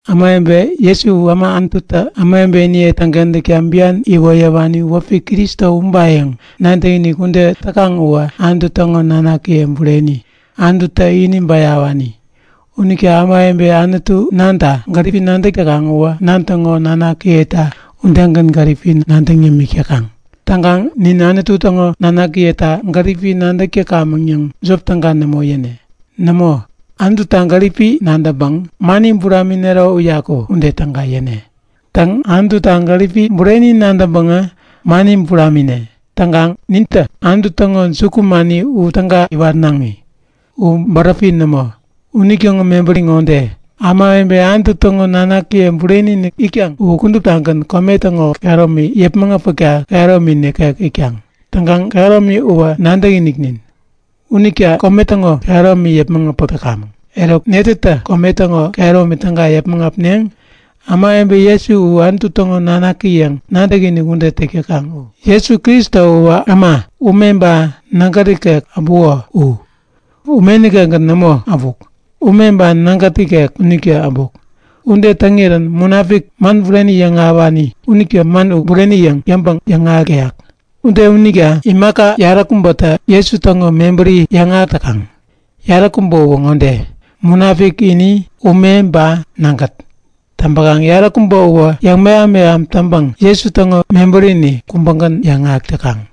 Ämawebe Jesu u äma Anututä ämawebeniye täŋkentäkta bian iwoyäwani wäpi Kristo ubayäŋ nadäkinik ude täk täkaŋ uwä Anutu täŋo nanakiye bureni, Anututä ini bäyawani. Unita ämawebe Anutu Nanta gäripi nadäk täkaŋ uwä Nan täŋo nanakiyeta udegän gäripi nadäŋ yämik täkaŋ. Täŋkaŋ nin Anutu täŋo nanakiyeta gäripi nadäk täkamäŋ yäŋ jop täga nämo yäne. Nämo, Anututa gäripi nadäŋpäŋ mani buraminero uyaku ude täga yäne. Bureni, Anututa gäripi nadäŋpäŋä, mani buramine. Täŋkaŋ nintä Anutu täŋo jukumani u täga iwatnaŋi. U bäräpi nämo. Unitäŋo mebäri ŋode; Ämawebe Anutu täŋo nanakiye bureni-inik itkaŋ u kuduptagän kome täŋo kehäromi yäpmäŋ äpäkta kehäromi nikek itkaŋ. Täŋkaŋ kehäromi uwä nadäkiniknin. Unitä kome täŋo kehäromi yäpmäŋ äpäk täkamäŋ. Eruk, netätä kome täŋo kehäromi täga yäpmäŋ äpneŋ? Ämawebe Jesu u Anutu täŋo Nanaki yäŋ nadäkinik ude täk täkaŋ u. Jesu Kristo uwä äma, ume ba nägät ikek äbuko u. Ume nikekgän nämo äbuk. Ume ba nägät ikek unitä äbuk. Ude täŋirän Munapik, man bureni yäŋahäwani unitä Man u bureni yäŋ yäŋpäŋ yäŋahäk täyak. Ude unita imaka yaräkubätä Jesu täŋo mebäri yäŋahäk täkaŋ. Yaräkubä uwä ŋode; Munapik ini, ume, ba nägät. Täŋpäkaŋ yaräkubä uwä yäŋmeham-meham taŋpäŋ Jesu täŋo mebärini kubägän yäŋahäk täkaŋ.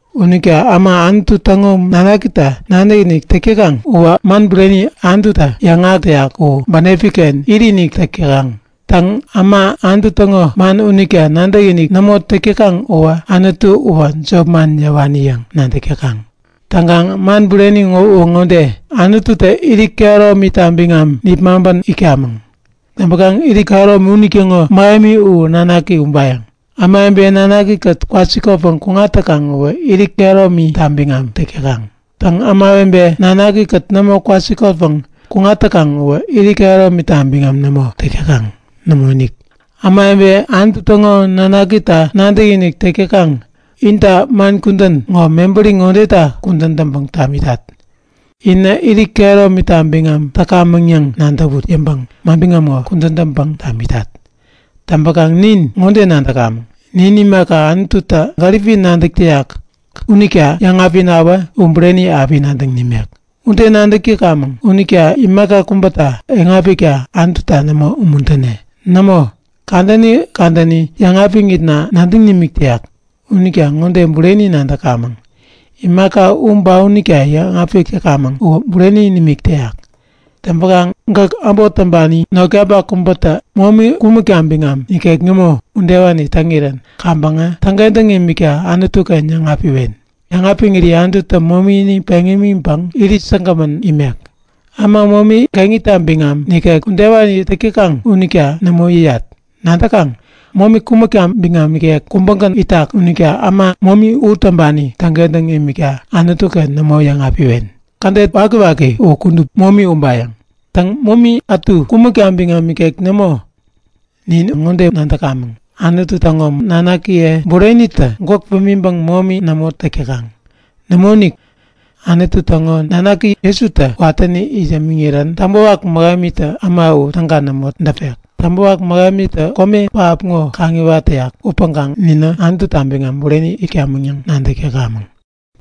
Unita äma Anutu täŋo Nanakita nadäkinik täk täkaŋ uwä man bureni, Anututä yäŋahäk täyak u bänepi-ken itinik täk täyak. Täŋ, äma, Anutu täŋo man unita nadäkinik nämo täk täkaŋ uwä Anutu uwä jopman yäwani yäŋ nadäk täkaŋ. Täŋkaŋ man bureni uwä ŋode; Anututä irit kehäromita biŋam nipmaŋpän itkamäŋ. Täŋpäkaŋ irit kehäromi unitäŋo mähemi u Nanaki ubayäŋ. Ämawebe Nanaki-kät kwasikotpäŋ kuŋat täkaŋ uwä irit kehäromita biŋam täk täkaŋ. Täŋ, ämawebe Nanaki-kät nämo kwasikotpäŋ kuŋat täkaŋ uwä irit kehäromita biŋam nämo täk täkaŋ. Nämoinik! Ämawebe Anutu täŋo Nanakita nadäkinik täk täkaŋ, inta man kudän ŋo mebäri ŋodeta kudän täŋpäŋ tamitat; Inä irit kehäromita biŋam täkamäŋ yäŋ nadäwut yäŋpäŋ manbiŋam ŋo kudän täŋpäŋ tamitat. Täŋpäkaŋ nin ŋode nadäkamäŋ; Nin imaka Anututä gäripi nadäk täyak unita yäŋapinawä, u bureni api nadäŋ nimek. Ude nadäk täkamäŋ unita Anutu dubiniken kuŋkaŋ imaka kubä yäŋapikta nämo umuntäne. Nämo! Kadäni kadäni yäŋapiŋitna nadäŋ nimik täyak. Unita ŋode bureni nadäkamäŋ; Imaka u ba unita yäŋapik täkamäŋ uwä bureni nimik täyak. Täŋpäkaŋ gäk äbot täŋpani notkapak kubätä momi kumäkta biŋam ikek nämo udewani täŋirän kaŋpäŋä täŋkentäŋ imikta Anutu-ken yäŋapiwen. Yäŋapiŋiri Anututä momini peŋ imiŋpäŋ irit säkgämän imek. Äma momi geŋita biŋam nikek udewani täk täkaŋ unita nämo yäyat. Nadäkaŋ? Momi kumäkta biŋam ikek kubägän itak unita äma momi u täŋpani täŋkentäŋ imikta Anutu-ken nämo yäŋapiwen. Kädet wakiwaki u kudup momi ubayäŋ. Täŋ, momi ätu kumäkta biŋam nikek nämo. Nin ŋode nadäkamäŋ; Anutu täŋo nanakiye burenitä gwäk pimiŋpäŋ momi nämo täk täkaŋ. Nämoinik, Anutu täŋo Nanaki Jesutä watäni it yämiŋirän Täŋpäwak Mähemitä äma u täga nämo däpek. Täŋpäwak Mähemitä kome pähap ŋo kaŋiwat täyak upäŋkaŋ ninä Anututa biŋam bureni itkamäŋ yäŋ nadäk täkamäŋ.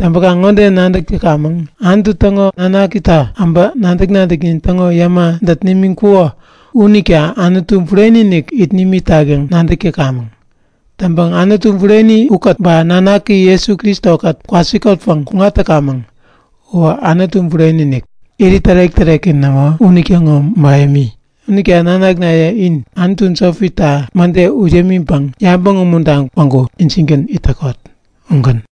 Täŋkaŋ ŋode nadäk täkamäŋ; Anutu täŋo Nanakitä äbä nadäk-nadäknin täŋo yäma dät nimiŋkuko unita Anutu Bureni-inik it nimitak yäŋ nadäk täkamäŋ. Täŋpäŋ Anutu Bureni ba Nanaki Jesu Kristo-kät kwasikotpäŋ kuŋat täkamäŋ. Uwä Anutu Bureni-inik, Irit Tärek-täreki nämo unitäŋo mähemi. Unita nanaknaye, in anutu jopita mäde ut yämiŋpäŋ yabäŋ umuntaŋ päŋku injingän it täkot. Ugän.